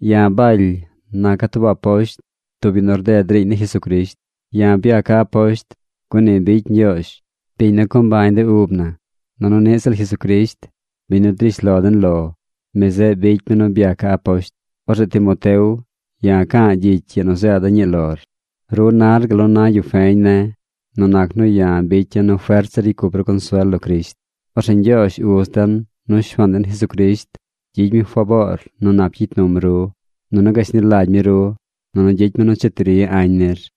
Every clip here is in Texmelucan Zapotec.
Ya̱ Baly naca̱ tub aposht, tub yu nu rded riiñ ni Jesucrisht. Ya̱ byaca̱ aposht, gun ni bicy Ñgyoozh, biñ nu co mbañ de ub na. Nunu niꞌ ziꞌl Jesucrisht, biñ nu drish lo den lo, mi zeꞌ bicy mi nu byaca̱ aposht. Orzeꞌ Timoteo, ya̱ ca̱a̱ gyicy ii nu zeeda̱ ñii lor. Ru nar gal nu na yu feñ ne̱ nu nac nu ya̱ bicya̱ nu fert zir ricy cup ru consuel lo Crisht. Orzeꞌ Ñgyoozh Uz den nu Shuaan den Jesucrisht gyicy mi faboor nu nap gyicy num ru, nunu gashni lagy mi ru, nunu gyicy mi nu cheti ri añ nir.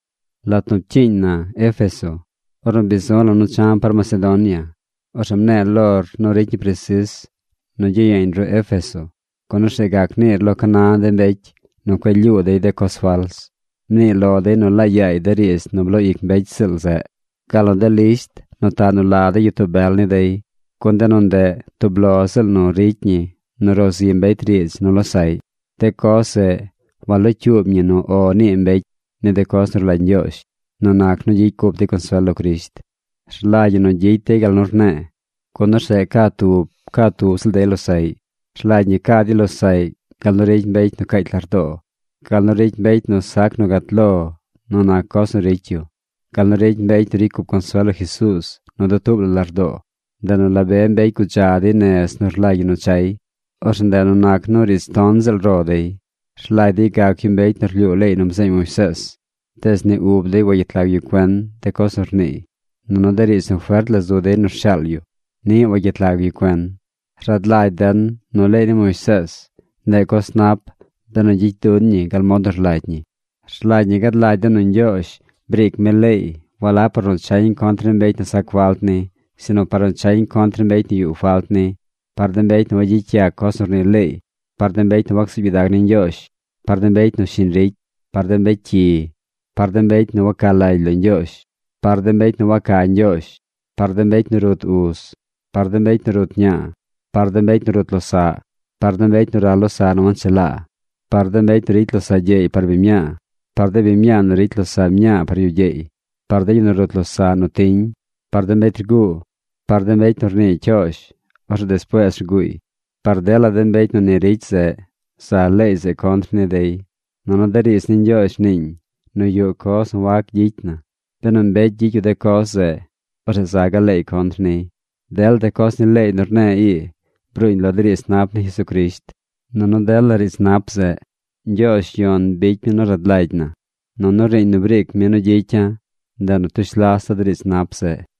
Lat nu pcyiiñ na Éfeso, ornu bi zu̱ la̱ nu cha̱ par Macedonia, orzeꞌ mne̱e̱ lor nu ricy ñi presis nu gyiyeeñ ru Éfeso, gun orzeꞌ gac niir lo ca na de mbecy nu cueꞌ lyuu dey de coz fals. Mnii lo dey nu laa yaay de riidz nu bloo ic mbecy ziꞌl zeꞌ, gal nu de lisht nu taꞌ nu la de gyitoo bel ni dey. Gun de nu ndeꞌ, tub lo ziꞌl nu ricy ñi nu ro zi mbecy riidz nu losaꞌy. De coz zeꞌ walocyuub ñi nu “O” nii mbecy ni de coz nu rlagy Ñgyoozh nu nac nu gyicy cup dey consuel lo Crisht. Rlagy ñi nu gyicy dey gal nu rne̱e̱, gun orzeꞌ ca tub ca tub ziꞌl dey losaꞌy. Rlagy ñi ca dey losaꞌy gal nu ricy mbecy nu caacy lardoo, gal nu ricy mbecy nu sac nu gat lo nu nac coz nu ricy yu, gal nu ricy mbecy nu ricy cup consuel lo Jesuuz nu dutuub la lardoo. Ndeꞌ nu la be mbecy gudza dey nez nu rlagy ñi nu chay. Orzeꞌ ndeꞌ nu nac nu riidz ton ziꞌl ro dey. Rlagy dey gac yu mbecy nu rlyuu leey nu bzeeñ Moisees, tees ni ub dey wagyet lag yu cuen de coz nu rniiy. Nunu de riidz nu fert la zu dey nu rshaal yu, niꞌ wagyet lag yu cuen. Rad lagy den nu leey ni Moisees, ndeꞌ coz nap benu gyicy duñ ñi gal mod nu rlagy ñi. Rlagy ñi gad lagy den nu Ñgyoozh briic mi leey walab par nu chañ contr ni mbecy nu sac falt ni, sinu par nu chañ contr ni mbecy nu yuꞌ falt ni, par de mbecy nu wagyicy yac coz nu rnii leey, par de mbecy nu wacsuub gyidag ni Ñgyoozh, par de mbecy nu shiñ ricy, par de mbecy cyi, par de mbecy nu waca lagy lo Ñgyoozh, par de mbecy nu waca Ñgyoozh, par de mbecy nu rut uz, par de mbecy nu rut ñaa, par de mbecy nu rut losaꞌ, par de mbecy nu ral losaꞌ nu wanchelaa, par de mbecy nu ricy losaꞌ gyeey par biñ mñaa, par de biñ mñaa nu ricy losaꞌ mñaa par yu gyeey, par de yu nu rut losaꞌ nu tiñ, par de mbecy rguu, par de mbecy nu rnii cyoozh, orzeꞌ despuees rguuy. Par dela de mbecy nu ni ricy zeꞌ, za leey zeꞌ contr ni dey. Nunu de riidz ni Ñgyoozh rniiñ nu yuꞌ coz nu wac gyicy na. Benu mbecy gyicy yu de coz zeꞌ, orzeꞌ za gaꞌ leey contr niy. Dela de coz ni leey nu rne̱e̱ ii bruuñ lo de riidz nap ni Jesucrisht. Nunu dela riidz nap zeꞌ, Ñgyoozh Yon bicy mi nu rad lagy na. Nunu riiñ nu briic mi nu gyicya̱, ndeꞌ nu tush lasa̱ de riidz nap zeꞌ.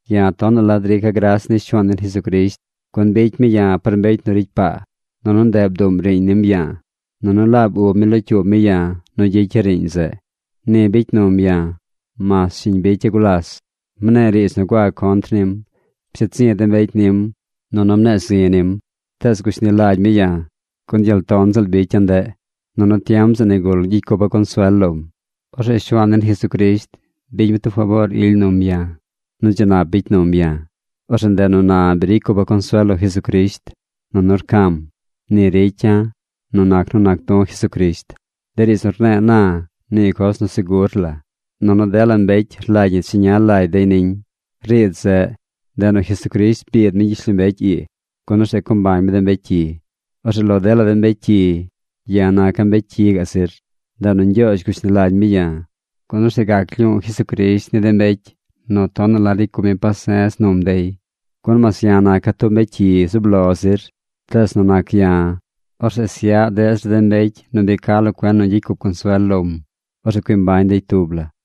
Ya̱ tonaꞌ la drica̱ gras ni Shuaan den Jesucrisht, gun bicy mi ya̱ par mbecy nu ricy paa, nunu ndeꞌ nu bduꞌm riiñ nim ya̱a̱. Nunu laab ub mi locyuub mi ya̱ nu gyicya̱ riiñ zeꞌ. Ni bicy num ya̱ mas shiñ bicya̱ gulas. Mne̱e̱ riidz nu gua contr nim. Psheed zi̱ de mbecy nim. Nunu mne̱e̱ zi nim. Tees gushni lagy mi ya̱, gun gyel ton ziꞌl bicya̱ ndeꞌ, nunu tiem zeꞌ nigul gyicy cupa̱ consuel lom. Orzeꞌ Shuaan den Jesucrisht bicy mi tub faboor ily num ya̱ nu dzi nap bicy num ya̱. Orzeꞌ ndeꞌ nu na bi ricy cupa̱ consuel lo Jesucrisht, nunu rca̱m. Ni ricya̱ nu nac nu nac du̱ Jesucrisht. De riidz nu rne̱e̱ na, nii coz nu segur la, nunu dela mbecy rlagy ñi cheña lagy dey niñ. Riidz zeꞌ, ndeꞌ nu Jesucrisht biid mi gyishlombecy ii, gun orzeꞌ co mbañ mi de mbecy cyi. Orzeꞌ lo dela de mbecy cyi, ya̱ naca̱ mbecy cyi gaꞌ zir. Ndeꞌ nu Ñgyoozh gushni lagy mi ya̱, gun orzeꞌ gac lyuu Jesucrisht ni de mbecy nu tonaꞌ la ricy cup mi pase̱z num dey. Gun mas ya̱ naca̱ tub mbecy cyi zub lo zir, tees nu nac ya̱, orzeꞌ syaꞌ deꞌ zir de mbecy nu bi ca lo cuen nu gyicy cup consuel lom. Orzeꞌ cui mbañ dey tub la.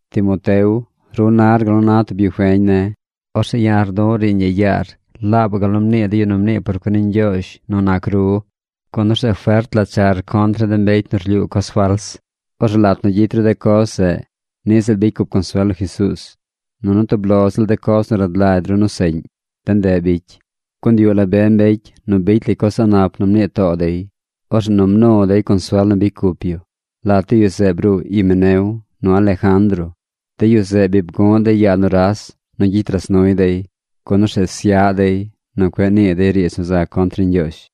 Timoteo, ru nar gal nu na tub yu feñ ne̱. Orzeꞌ ya̱ rdu̱ꞌ riiñ ii yaar laabaꞌ gal nu mnii de yu nu mnii por cuen ni Ñgyoozh nu nac ru. Gun orzeꞌ fert la char contr ni de mbecy nu rlyuu coz fals. Orzeꞌ lat nu gyicy ru de coz zeꞌ, niꞌ ziꞌl bicy cup consuel lo Jesuuz. Nunu tub lo ziꞌl de coz nu rad lagy ru nu seꞌñ, de ndeꞌ bicy, gun yuꞌ la be mbecy nu bicy lay coz a̱ꞌ nap nu mnii too dey. Orzeꞌ nu mnu dey consuel nu bicy cup yu. Lat de yu zeꞌ bruu Himeneo nu Alejandro. De yu zeꞌ bi bgu̱ꞌ dey yaa nuras nu gyicy ras nuy dey, gun orzeꞌ syaꞌ dey nu cueꞌ nii dey riidz nu za contr ni Ñgyoozh.